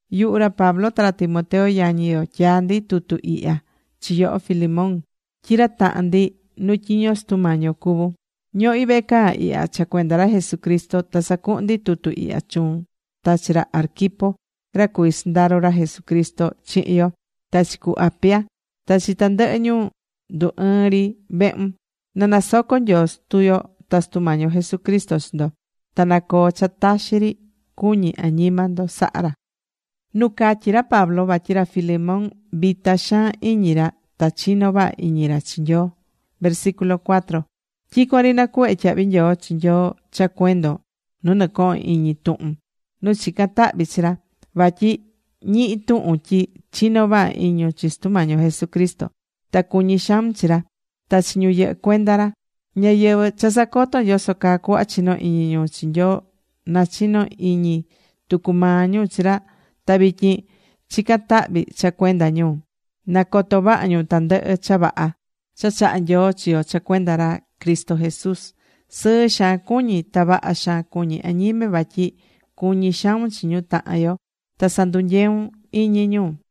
Yuhu ra Pablo ta ra Timoteo yañi yo, tyaá ndi tutu ihya chi yoho, Filemón, tyi ra tahan ndi nu tyiño Sutu Mañi yo cuvún. Ñohí vehe caa ihya cha cuenda ra Jesucristo ta sacuhún ndi tutu ihya chuun ta chi ra Arquipo, ra cuvi sɨndaro ra Jesucristo chihin yo, ta chi cu Apia, ta chi tandɨhɨ ñu ndu ɨɨ́n ri vehun. Na nasoco Nyoo Sutu yo ta Sutu Mañi yo Jesucristo chi ndo. Ta na coo cha taxi ri cuñi añima ndo sahá ra.Nu catyi ra Pablo vatyi ra Filemón vita xaan iñi ra ta chino vaha iñi ra chi Nyoo Tyicuan ri nacuhvé tyahvi nyoo chi Nyoi cha cuendon nu nɨcohón iñi tuhun, nu chicán tahvi chi ra. Vatyi ñihi̱ tuhun tyi chinó vaha iñun chi Sutu Mañi yo Jesucristo, ta cuñí xaun chi ra ta chi ñu yɨhɨ́ cuenda ra. Ñáyɨvɨ cha sacotón yoso caa cuhva chinó iñun chi Nyoo, nachino̱ iñi tucu maa ñu chi ra ta vityin chicán tahvi cha cuenda ñu, na coto vaha ñu tandɨhɨ cha vaha cha chahá Nyoo chi yo cha cuenda ra Cristo Jesús. Sɨɨ xaan cuñí, ta vaha xaan cuñí añime vatyi cuñí xaun chi ñu tahan yo, ta sandunyeún iñi ñu.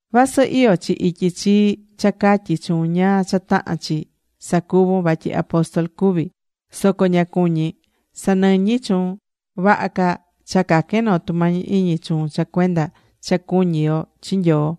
Vasɨ iyó chi ityi chii cha catyi chuun ñáá cha tahán chi sacuvun vatyi apóstol cuví, soco ña cuñí sanɨñi chuun. Vaha ca cha caquen noo tumañi iñi chuun cha cuenda cha cuñí yo chi Nyoo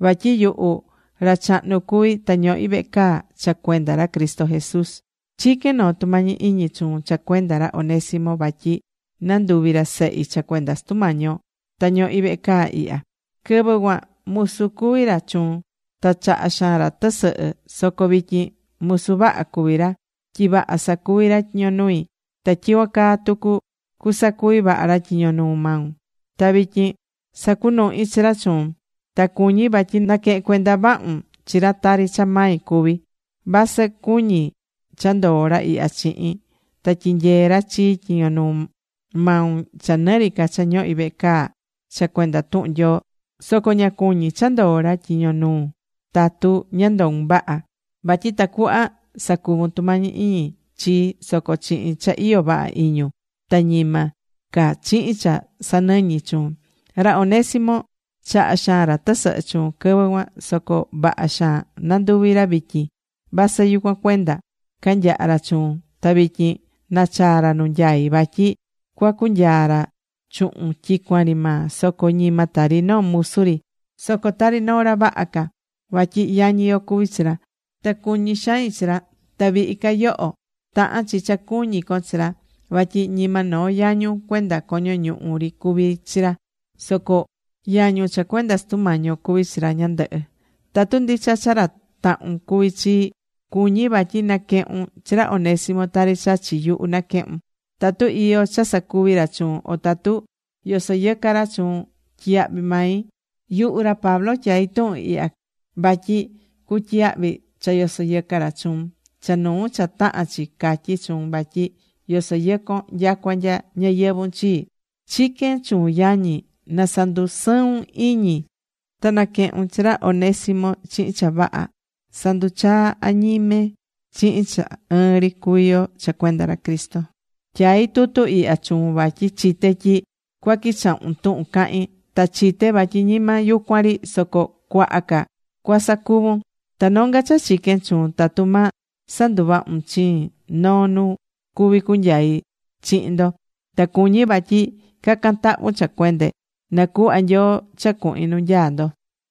vatyi yuhu ra chahnu cuví ta ñohí vehe caa cha cuenda ra Cristo Jesús. Chiquén noo tumañi iñi chuun cha cuenda ra Onésimo vatyi nanduvi̱ ra sehi cha cuenda Sutu Mañi yo nu ñohí vehe caa ihya. Quɨvɨ cuan musu cuvi̱ ra chuun, ta chaha xaan ra tɨsɨhɨ, soco vityin musu vaha cuví ra, tyi vaha sacuví ra tyiño nui ta tyicuan caa tucu cusacuvi vaha ra tyiño nuu maun. Ta vityin sacunuhí chi ra chuun. Ta cuñí vatyi na̱quehen cuenda vahun chi ra tari cha mai cuví. Vasɨ cuñí cha ndoo ra ihya chihin, ta tyinyee ra chii tyiño nuu maun cha nɨri ca cha ñohí vehe caa cha cuenda tuhun Nyoo, soco ña cuñí cha ndoo ra tyiño nuun tatu ña ndoun vaha, vatyi tacuhva sacuvun tumañi iñi chii soco chihin cha iyó vaha iñun ta ñima ca chihin cha sanɨñi̱ chuun. Ra Onésimo chaha̱ xaan ra tɨsɨhɨ chuun quɨvɨ cuan, soco vaha xaan nanduvi̱ ra vityin, vasɨ yucuan cuenda canyaha̱ ra chuun ta vityin nachaa ra nu nyaún vatyi cuacunyaa ra chuhun tyicuan ri maa soco ñima tari noo musu ri, soco tari noo ra vaha ca. Vatyi yañi yo cuví chi ra. Ta cuñí xain chi ra, ta vihi ca yoho, tahán chi cha cuñí con chi ra. Vatyi ñima noo yañun cuenda coño ñuhu ri cuví chi ra. Soco yañun cha cuenda Sutu Mañi yo cuví chi ra ñandɨhɨ. Tatu ndicha cha ra tahun cuví chii, cuñí vatyi na̱quehun chi ra Onésimo tari cha chi yuhu naquehún. Tatu iyó cha sacuvi̱ ra chuun, o tatu yosoyɨcá ra chuun, tyiyahvi mai. Yuhu ra Pablo tyaí tuhun ihya vatyi cutyiyahvi cha yosoyɨcá ra chuun, cha nuu cha tahán chi catyí chuun vatyi yosoyɨcón nyacua nya ñayɨvun chii. Chiquén chuun, yañi, na sandusɨun iñi ta na̱quehun chi ra Onésimo chihin cha vaha. Sa̱nduchaa añime chihin cha ɨɨn ri cuví yo cha cuenda ra Cristo. Tyaí tutu ihya chuun vatyi chité tyi cuaquichahun tuhun cahín. Ta chité vatyi ñima yucuan ri, soco cuaha ca cuasacuvun. Ta nonga cha chiquén chuun tatu ma sanduvahun chiin noo nu cuví cunyai chihin ndo. Ta cuñí vatyi ca̱can tahvun cha cuende, na cuhva Nyoo cha cuhin nu nyaá ndo.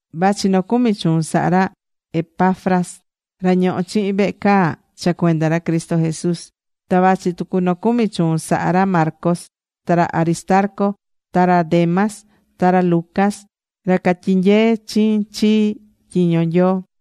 Vachi nocumi chuun sahá ra Epafras, ra ñoho chihin vehe caa cha cuenda ra Cristo Jesús. Ta vachi tucu nocumi chuun sahá ra Marcos, ta ra Aristarco ta ra Demas, ta ra Lucas, ra catyinyeé chii chihin tyiño Nyoo.